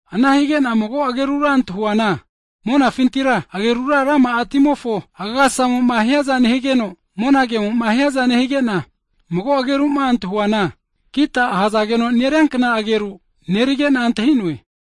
Ana hige'na mago agerura antahuana monafintira agerura rama'a timofo agasasamo'ma hiaza nehigeno, mona kemo'ma hiaza nehige'na, mago ageru'ma antahuana kita (harp) ahazageno neriankna ageru nerige'na antahi'noe.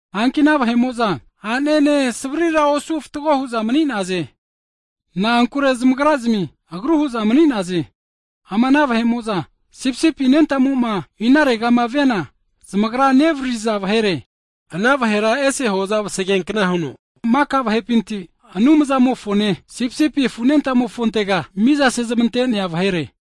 Hanki ana vahe'mo'za a'nene savrira osu fatgo hu'za mani'naze. Na'ankure zamagrazmi agru hu'za mani'naze. Ama ana vahe'mo'za Sipisipi Anentamo'ma inaregama viana zamagra nevaririza vahere. Ana vahera Anumzamo'a ese hoza vasageankna huno maka vahepinti miza sezmante'neankino, Anumzamofone Sipisipi afu Anentamofo naga manigahaze.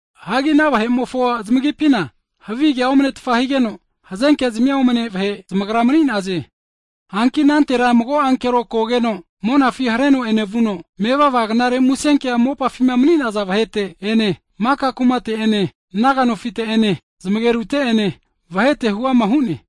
Hagi ana vahe'mofo zamagipina havigea omnetfa higeno, hazenkezmia omane vahe zamagra mani'naze. Hagi anantera mago ankero kogeno monafi hareno enevuno, mevava Knare Musenkea mopafima mani'naza vahete ene, maka kumate'ene naga nofite'ene, zamagerute'ene, vahete'ene huama hu'ne.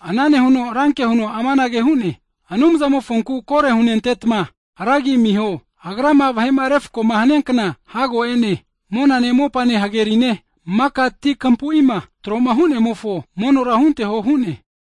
Ana nehuno ranke huno amanage hu'ne, Anumzamofonku kore hunentetma ra agi amiho. Agrama vahe'ma refko'ma haniankna hago e'ne. Monane mopane hagerine, maka tinkampuima tro'ma hu'nemofo monora hunteho hu'ne.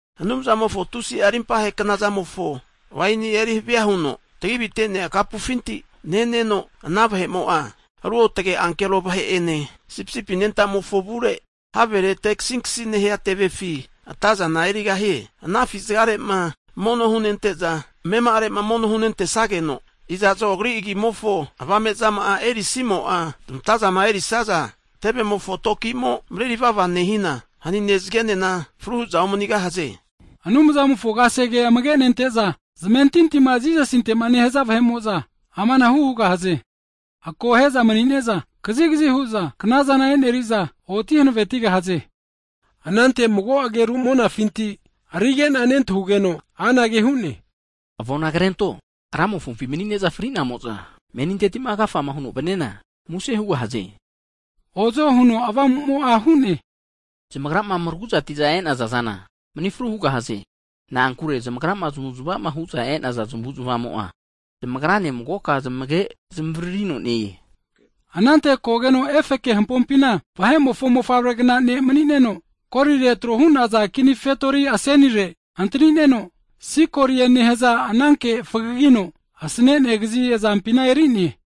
Anumzamofo tusi'a rimpahe knazamofo waini erihavia huno tagi avite'nea kapufinti neneno, ana vahe'mo'a ruotge ankero vahe'ene, Sipisipi anentamofo avure, havere te kasinkasi nehia tevefi atazana erigahie. Ana afi zagare'ma mono hunente'za, amema'are'ma mono hunentesageno, iza'zo agri agimofo avame'zama'a erisamo'za, zamatazama erisaza tevemofo tokimo mareri vava nehina, hanine zagenena fru hu'za omanigahaze. Anumzamofo kasege amage'nente'za zamentintima Jisasinte nehaza vahe'mo'za amanahu hugahaze, akohe'za mani'ne'za kazigazi hu'za knazana eneri'za oti hanavetigahaze. Anante mago ageru monafinti arige'na nentahugeno anage hu'ne, Avona krento, Ramofompi mani'ne'za fri'namo'za, meninteti'ma agafa huno vaniana muse hugahaze! Ozo huno Avamumo'a hu'ne. Zamagrama maraguzati'za e'naza zana manifru hugahaze. Na'ankure zamagrama knare zamavu'zamavama hu'zama e'naza zamavu'zamavamo'a, zamagrane magoka zamage'a zamavaririno ne-e. Anante kogeno efeke hampopina Vahe'mofo Mofavregna Ne' mani'neno, golire tro hu'naza kini fetori asenire antanineno, sikolie nehaza ananke fagagino asane'nea kazi azampina eri'ne.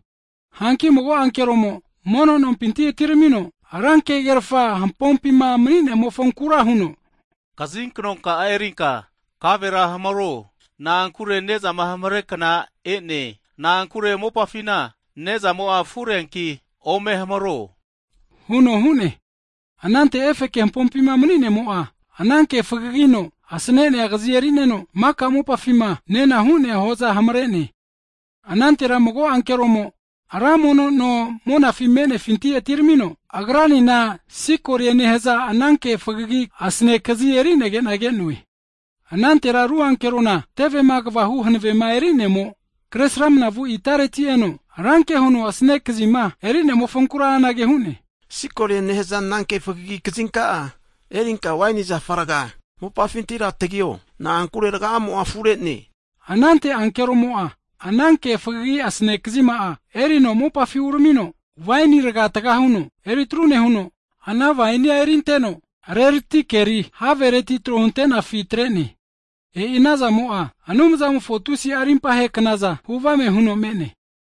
Hanki mago ankeromo mono nompinti atiramino, ranke huno hampopima mani'nemofonkura huno, kazinkno ka'a erinka kavera hamaro. Na'ankure ne'zama hamare kna e'ne, na'ankure mopafina nezamo'a afureanki ome hamaro huno hu'ne. Anante efeke hampopima mani'nemo'a ananke fagagino asane'nea kazi erino, maka mopafima nenahu'nea hoza hamare'ne. Anantera mago ankeromo, ra mono no monafi me'nefinti atiramino, agranena sikolie nehaza ananke fagagino asane kazi eri'negena ke'noe. Anante ru ankerona, tevema kvahu hanavema eri'nemo, kresramnavu itareti eno, ranke huno asane kazima eri'nemofonkura anage hu'ne, Sikolie nehaza ananke fagagi kazinka'a erinka waini zafa raga mopafintira tagio, na'ankure raga'amo'a afure'ne. Anante ankeromo'a ananke fagagi asane kazima'a erino mopafi uramino waini raga taga huno eri atru nehuno, ana wainia erinteno rerati keri havereti tro huntenefi atre'ne. E'i anazamo'a Anumzamofo tusi'a rimpahe knaza huvame huno me'ne.